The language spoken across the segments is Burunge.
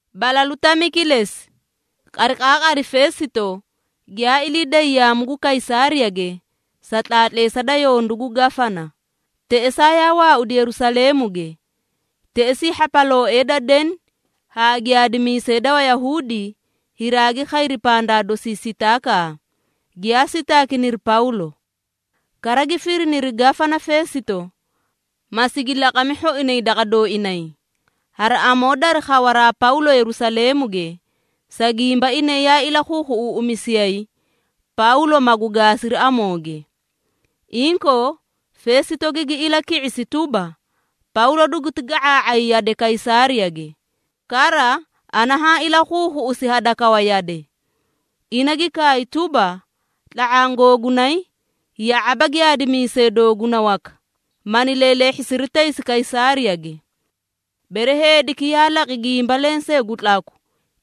Balalu tami kilesi, qariqaaqari Feesito giyaa ilii day yaamu gu Kaysaariyage sa tlaatleesa da yondu gu Gafana, teꞌesaa yaa waaudi Yerusaleemuge. Teꞌesii hhapalooee da deni haa giyaadimiisee da Wayahuudi, hiraagi khayri pandaa dosi sitaakaa, giyaa sitaakiniri Pawlo. Kara gi firiniri Gafana Feesito, ma sigi laqami hhoinay daqa dooinay, hari amoo dari khawaraa Pawlo Yerusaleemuge, sa gimba inay yaa ilakhuukhuꞌuuꞌumisiyay, Pawlo magu gaasiri amooge. Inkoo, Feesito gigi ilaki⁄isi tuba, “Pawlo duguti ga⁄aa⁄ay yade Kaysaariyage, kara ana haã ilakhuukhuꞌusi hadakawa yade. Ina gi kaay tuba, ‘Tla⁄aã googunay, ya⁄aba giyaadimiisee dooguna waka, mani leeleehhisiri taysi Kaysaariyage. Bere heediki yaa laqi gimba lensee gu tlaku,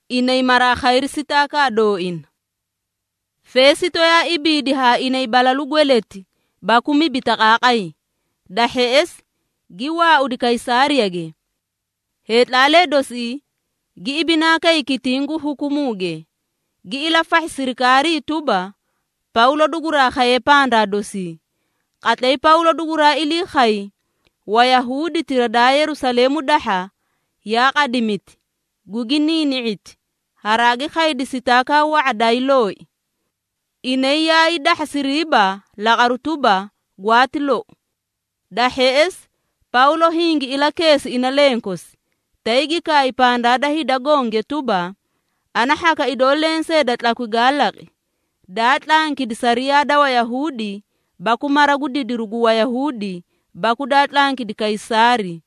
inay maraa khayri sitaakaa dooina.’” Feesito yaa ibiidi haa inay balalu dagati baku mibi taqaaqay, da hheꞌesi gi waaudi Kaysaariyage. Heetlaalee dosii gi ibinaa kay kitiĩ gu hukumuuge, gi ilafahhi sirikaarii tuba, Pawlo duguraa khaye pandaa dosii. Qatlay Pawlo duguraa ilii khay, Wayahuuditira daa Yerusaleemu dahha, yaa qadimiti, gugi niini⁄iti, haraagi khaydi sitaakaa wa⁄a daayii loi. Inay yaa hiidahhasiriiba laqaru tuba, gwaati lou. Da hheꞌesi Pawlo hingi ilakeesi ina lenkosi, tay gi kaay pandaa da hida gonge tuba, “Ana hhaka idoo lensee da tlakwi gaa laqi, daa tlankidi sariyaa da Wayahuudi baku mara gu didiru gu Wayahuudi baku daa tlankidi Kaysaari.”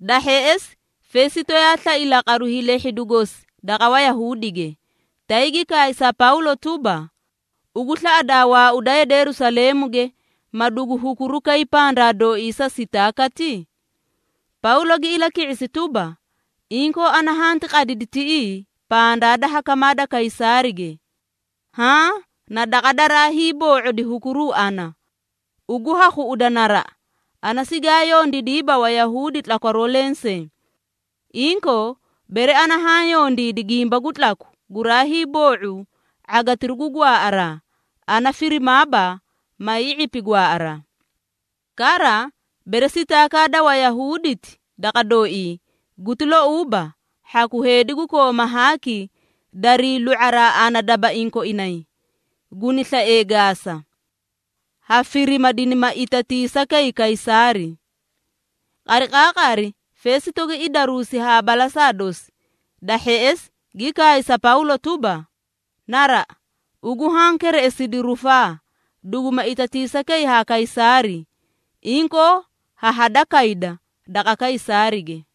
Da hheꞌesi Feesito yaa slai laqaru hiilehhidu gosi daqa Wayahuudige, tay gi kaay sa Pawlo tuba, “Ugu slaꞌadaa waauda yade Yerusaleemuge, ma dugu hukuruu kay pandaa dooii sa sitaakati?” Pawlo gi ilaki⁄isi tuba, “Inkoo, ana hanti qadida tiꞌii pandaa da hakamaa da Kaysaarige, haã na daqa daraa hiiboo⁄odi hukuruu ana. Ugu ha khuꞌuda naraꞌa, ana sigaa yondiidiiba Wayahuudi tlakwaroo lensee. Inkoo, bere ana haã yondiidi gimba gu tlaku guraa hiiboo⁄u ⁄agitiru gu gwaaꞌaraa, ana firimaaba, ma hii⁄ipi gwaaꞌaraa. Kara, bere sitaakaa da Wayahuuditi daqa dooii guti louuba, hhaku heedi gu kooma haaki darii lu⁄araa ana dabaiĩ koinay, guni slaee gaasa. Ha firima, dinima itatiisa kay Kaysaari.” Qariqaaqari Feesito gi idaruusi haa balasaa dosi, da hheꞌesi gi kaay sa Pawlo tuba, “Naraꞌa! Ugu haã kereꞌesidi rufaa, duguma itatiisa kay ha Kaysaari, inkoo ha hada kayda daqa Kaysaarige.”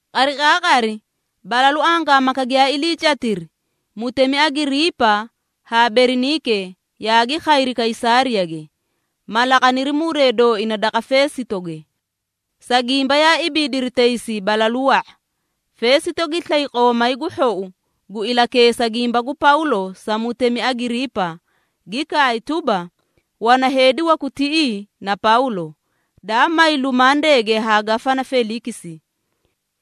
Qariqaaqari balalu angaamaka giyaa iliicatiri, Mutemi Agiriipa haa Beriniike yaagi khayri Kaysaariyage, ma laqaniri muree dooina daqa Feesitoge. Sa gimba yaa ibiidiri taysi balalu wa⁄a, Feesito gi slay qoomay gu hhou gu ilakeesa gimba gu Pawlo sa mutemi Agiriipa, gi kaay tuba, “Wana heedi waku tiꞌii na Pawlo, daa may lumandeege ha Gafana Feliikisi.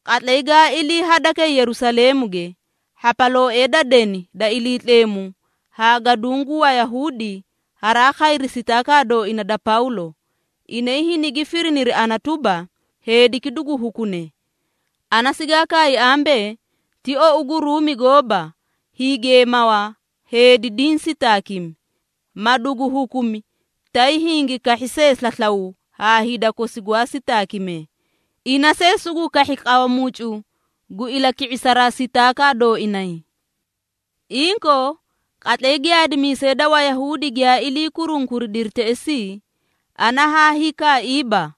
Qatlay gaa ilii hadakay Yerusaleemuge, hhapalooee da deni da Iliitleemu haa gaduũ gu Wayahuudi haraa khayri sitaakaa dooina da Pawlo, inay hinigi firiniri ana tuba, heediki dugu hukune. Ana sigaa kaay ambee, ti ou gu Ruumi gooba hiigeemawa heedi diĩ sitaakimi, ma dugu hukumi tay hingi kahhi see slaslaw haa hida kosi gwaa sitaakimee, ina see sugu kahhi qawa mucu gu ilaki⁄isaraa sitaakaa dooinay. Inkoo, qatlay giyaadimiisee da Wayahuudi giyaa ilii kurunkuridiri teꞌesii, ana haa hiikaaiiba.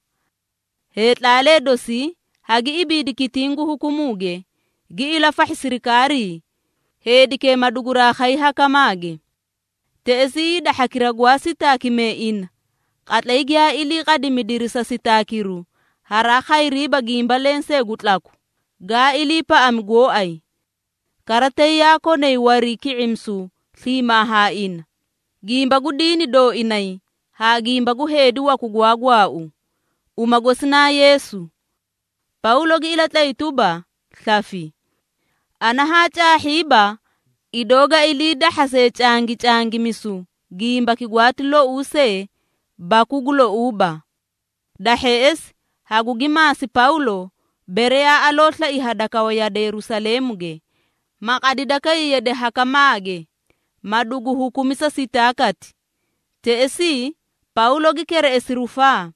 Heetlaalee dosii hagi ibiidi kitiĩ gu hukumuuge, gi ilafahhi sirikaarii, heedikee maduguraa khay hakamaage. Teꞌesii hida hhakira gwaa sitaakimee ina, qatlay giyaa ilii qadimidiri sa sitaakiru, haraa khayriiba gimba lensee gu tlakwu, gaa iliipaꞌami gooay. Kara tay yaa konay wariiki⁄imisu sliimaa haa ina, gimba gu diini dooinay haa gimba gu heedi waku gwaa gwaau, uma gosi naa Yeesu. Pawlo gi ilatlay tuba, slafi. Ana haa caahhiiba, idoo ga ilii dahhase cangicangimisu gimbaki gwaati louu see baku gu louuba. Da hheꞌesi, hagugi maasi Pawlo, bere yaa aloo slai hadakawa yade Yerusaleemuge, ma qadida kay yade hakamaage, ma dugu hukumi sa sitaakati. Teꞌesii, Pawlo gi kereꞌesi rufaa,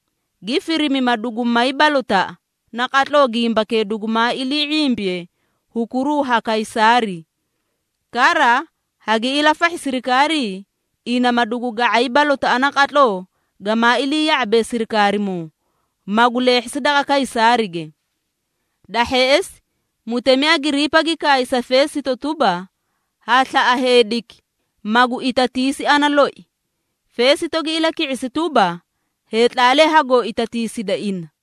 gi firimi ma dugu may balotaꞌa naqatloo gimbakee dugumaa ilii ⁄imbiye hukuruu ha Kaysaari. Kara, hagi ilafahhi sirikaarii, ina ma dugu ga⁄ay balotaꞌa naqatloo gamaa ilii ya⁄abe sirikaarimoo, magu leehhisi daqa Kaysaarige.” Da hheꞌesi, mutemi Agiriipa gi kaay sa Feesito tuba, “Ha slaꞌa heediki magu itatiisi ana loi.” Feesito gi ilaki⁄isi tuba, “Heetlaalee hagoo itatiisida ina.”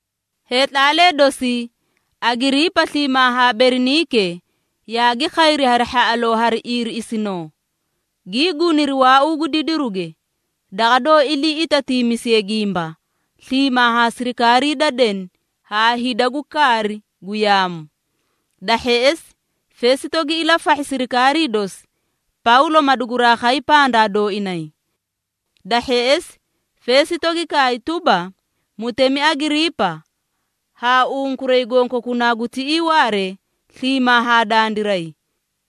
Heetlaalee dosii, Agiriipa sliimaa haa Beriniike yaagi khayri hari hhaꞌaloo haa iiriꞌisinoo, gii guniri waauu gu didiruge, daqa doó ilii itatiimisiyee gimba, sliimaa haa sirikaarii da deni haa hida gu kaari gu yaamu. Da hheꞌesi, Feesito gi ilafahhi sirikaarii dosi, Pawlo maduguraa khay pandaa dooinay. Da hheꞌesi, Feesito gi kaay tuba, “Mutemi Agiriipa haa unkuray gonkokunaa gu tiꞌii waaree sliimaa haa dandiray,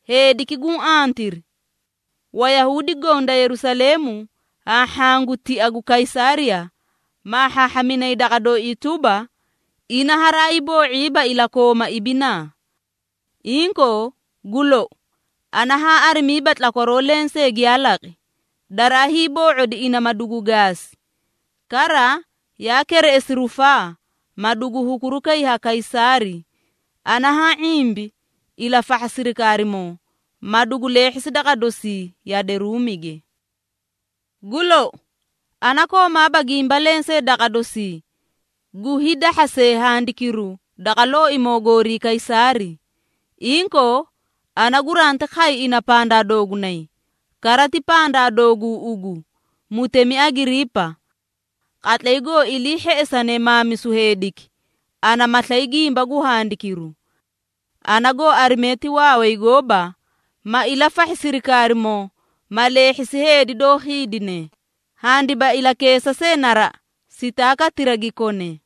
heediki guũ antiri! Wayahuudi goõ da Yerusaleemu haa hhaã gu tia gu Kaysaariya, maahhaahhaminay daqa dooii tuba, ina haraayii boo⁄iiba ilakooma ibinaa. Inkoo gu lou, ana haa arimiiba tlakwaroo lensee giyaa laqi, daraa hiiboo⁄odi ina ma dugu gaasi. Kara yaa kereꞌesi rufaa, ma dugu hukuru kayi ha Kaysaari, ana haã ⁄imbi ilafahha sirikaarimoo, ma dugu leehhisi daqa dosii yade Ruumige. Gu lou, ana koomaaba gimba lensee daqa dosii gu hiidahhase handikiru daqa looimoo goorii Kaysaari. Inkoo, ana guranti khay ina pandaa doogunay, kara ti pandaa dooguu ugu, mutemi Agiriipa. Qatlay goo ilii hheꞌesane maamisu heediki, ana ma slay gimba gu handikiru. Ana goo arime ti waaway gooba, ma ilafahhi sirikaarimoo ma leehhisi heedi doó khiidine, handiba ilakeesa see naraꞌa sitaakatira gi kone.”